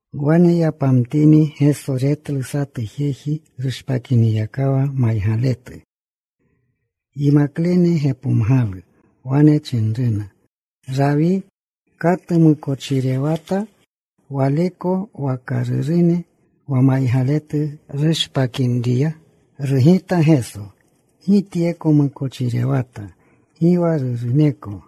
Wane yapamtini Geso retlu satu jeji rushpakiniyakawa maygaletu. Yimaklene gepomgalu. Wane chinruna, “Rawi, ¿katu mukochirewata, waleko waka rurune, wa maygaletu rushpakinriya?” Rugita Geso, “Gi tyeko mukochirewata, gi wa ruruneko,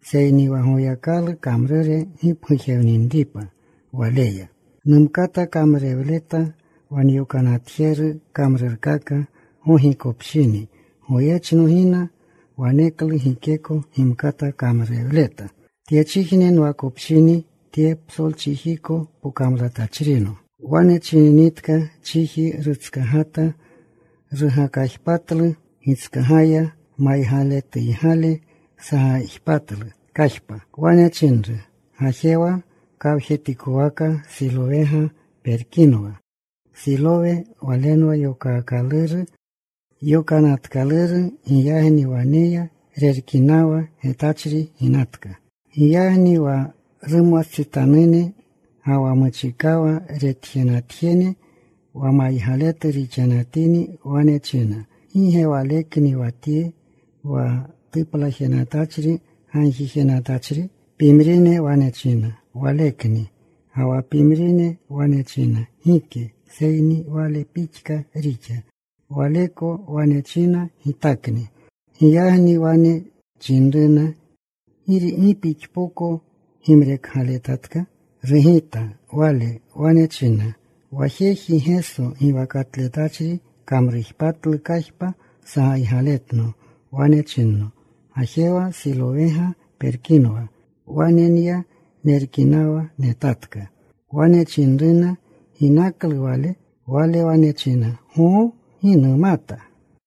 seyni wa Goyakalu kamrure gipgujewninripa waleya. Numkata kamrurewleta wa nyokanatjeru kamrurkaka gogikopshini. Goyechno gina. Waneklu gikeko gimkata kamrurewleta. Tyechijne nwakopshini, tye psolchijneko pokamlatachrino.” Wane chininitka, chiji rutskagata. Rugakajpatlu gitskagaya. Maygaletuygale sagajpatlu kajpa. Wane chinru, “Gajewa. Kawjetikwaka Silowega perkapinwa.” Silowe walenwa yokaakaluru, Yokanatkaluru. Giyagni wane ya. Rerkinawa. Getachri ginatka. Giyagni wa rumwastsitanune, ga wa muchikawa retanatjene wa maygaletu rixanatini, wane chinna, “¿Gi ge walekni wa tye, wa tuplajenatachri gagjijenatachri?” Pimrine wane china, “Walekni.” Ga wa pimrine wane china, “Gike, seyni wale pixka rixa.” Waleko wane china, “Gitakni.” Giyagni wane chinruna, “¿Gi pixpoko gimrekgaletatka?” Rugita wale. Wane china, “Wa jeji Geso giwakatletachri, kamrujpatlu kajpa. Sagaygaletno. Wane chinno, ‘Gajewa. Silowega perkapinwa.’ Wane nya. Nerkinawa. Netatka.” Wane chinruna, “¿Ginaklu Wale?” Wale wane china, “Goo. Gi numata.”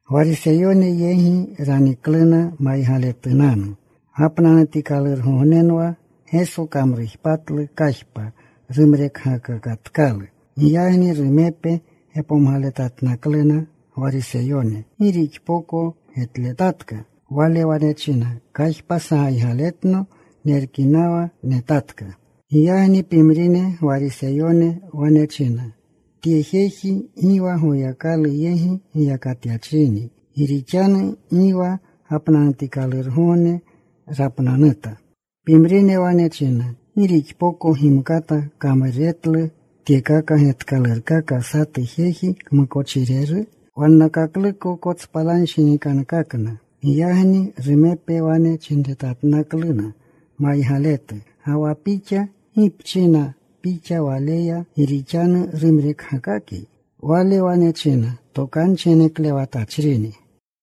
Gwariseyone yegi ranikluna maygaletunanu. Gapnanutikalurgognenwa Geso kamrujpatlu kajpa, rumrekgakakatkalu. Giyagni rumepe gepomgaletatnakluna Gwariseyone gi rixpoko getletatka. Wale wane chinna, “Kajpa sagaygaletno. Nerkinawa. Netatka.” Giyagni pimrine Gwariseyone wane china, “Tye jeji gi wa Goyakalu yegi giyakatyachrini, gi rixanu gi wa gapnanutikalurgogne rapnanuta.” Pimrine wane china, “¿Gi rixpoko gimkata kamruretlu tyekaka getkalurkaka satu jeji kmukochireru?” Wannakakluko kotspalanshinikankakna. Giyagni rumepe wane chinretatnakluna maygaletu, “Ga wa pixa, ¿gi pchina pixa Waleya, gi rixanu rumrekgakakyi?” Wale wane china, “Tokanchi geneklewatachrini.”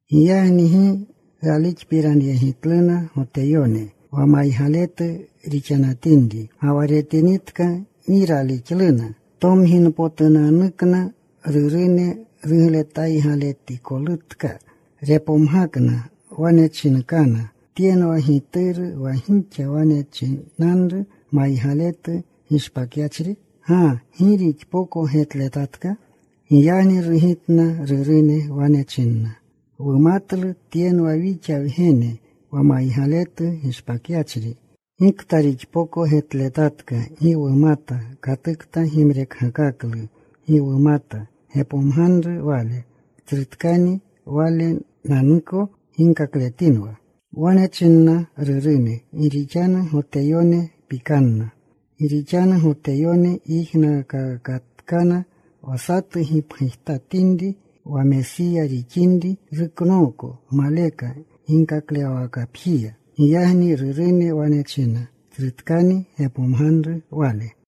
Giyagni gi ralixpiranyegitluna Goteyone wa maygaletu rixanatinri, ga wa retinritka. Gi ralixluna tomginpotunanukna rurune rugletaygaletikolutka. Repomgakna. Wane chinkana, “¿Tyenwa gituru, wa gixa wane chinanru maygaletu gishpakyachri? ¿Ga gi rixpoko getletatka?” Giyagni rugitna rurune. Wane chinna, “Wumatlu tyenwa wixa wgene wa maygaletu gishpakyachri. Gikta rixpoko getletatka gi wumata. Katukta gimrekgakaklu gi wumata. Gepomganru wale. Tsrutkani wale. Walenanuko ginkakletinwa.” Wane chinna rurune gi rixanu Goteyone pikanna. Gi rixanu Goteyone yijnaakakatkana wa satu gipgujtatinri wa Mesiya rixinri, ruknooko maleka ginkaklewawakapjiya. Giyagni rurune wane china, “Tsrutkani. Gepomganru wale.”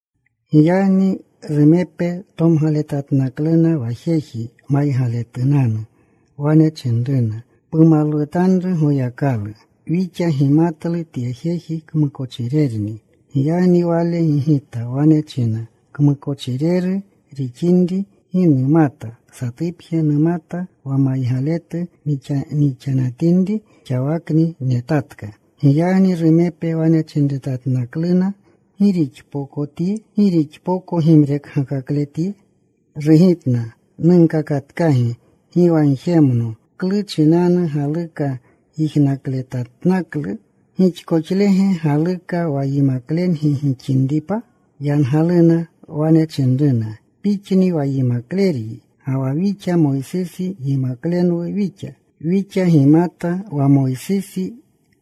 Giyagni rumepe tomgaletatnakluna wa jeji maygaletunanu. Wane chinruna, “Pumalwutanru Goyakalu. Wixa gimatlu tye jeji kmukochirerni.” Giyagni wale gigita. Wane china, “Kmukochireru rixinri, gi numata. Satupje numata, wa maygaletu nixanatinri, xawakni netatka.” Giyagni rumepe wane chinretatnakluna, “¿Gi rixpokotyi? ¿Gi rixpoko gimrekgakakletyi?” Rugitna, “Nunkakatkagi. Gi wa gjemno. ¿Klu chinanu galuka yijnakletatnaklu? ¿Gixkoxlege galuklu wa yimaklengi gixinripa?” Yangaluna. Wane chinruna, “Pixni wa yimakleryi, ga wa wixa Moysisi yimaklenwu wixa. Wixa gimata wa Moysisi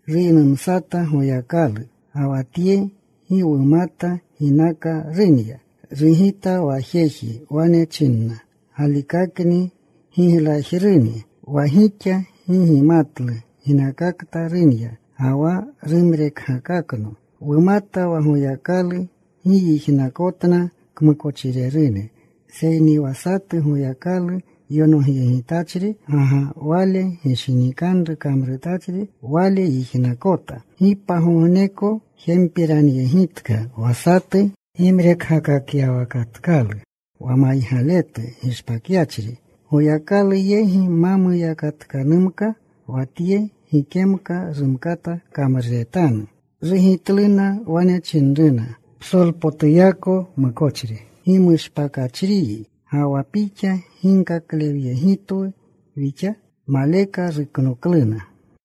ruynumsata Goyakalu. Ga wa Tye, gi wumata ginaka runya.” Rugita wa jeji. Wane chinna, “Galikakni giglajruni wa gixa gi gimatlu ginakakta runya, ga wa rumrekgakakno. Wumata wa Goyakalu gi yijnakotna kmukochirerune, seyni wa satu Goyakalu yonogyegitachri, ga wa Wale gishinikanru kamrutachri, wale yijnakota. Gi pagogneko jempiranyegitka wa satu gimrekgakakyawakatkalu wa maygaletu gishpakyachri. Goyakalu yegi ma muyakatkanumka wa Tye gikemka rumkata kamruretanu.” Rugitluna. Wane chinruna, “Psolpotuyako mukochri gimushpakachriyi, ¿ga wa pixa ginkaklewyegitwu wixa?” Maleka ruknokluna.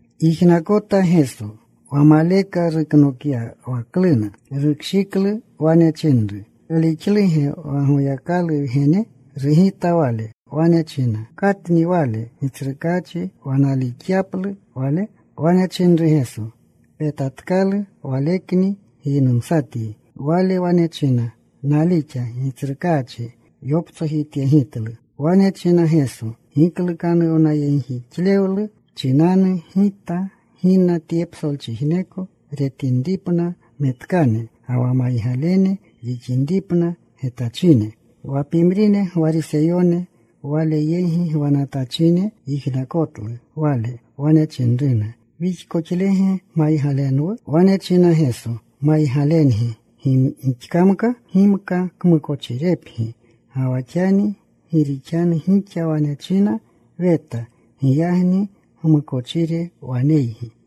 Yijnakota Geso wa maleka ruknokyawakluna. Rukshiklu. Wane chinru, “¿Palixluge wa Goyakalu Wgene?” Rugita wale. Wane china, “¿Katni Wale, Gitsrukaachi, wa nalixyaplu Wale?” Wane chinru Geso, “Petatkalu. Walekni giynumsatyi.” Wale wane china, “Nalixa, Gitsrukaachi.” Yoptsojityegitlu. Wane china Geso, “Giklukanuwnayegjixlewlu chinanu, Gita gina tye psolchijneko, retinripna metkane, ga wa maygalene rixinripna getachine.” Wa pimrine Gwariseyone Wale yegi gwanatachine yijnakotlu Wale. Wane chinruna, “¿Wixkoxlege maygalenwu?” Wane chinna Geso, “Maygalengi gixkamka, gimka kmukochirepgi. Ga wa xani gi rixanu gixa wane china, ‘Weta,’ giyagni gmukochire waneygi.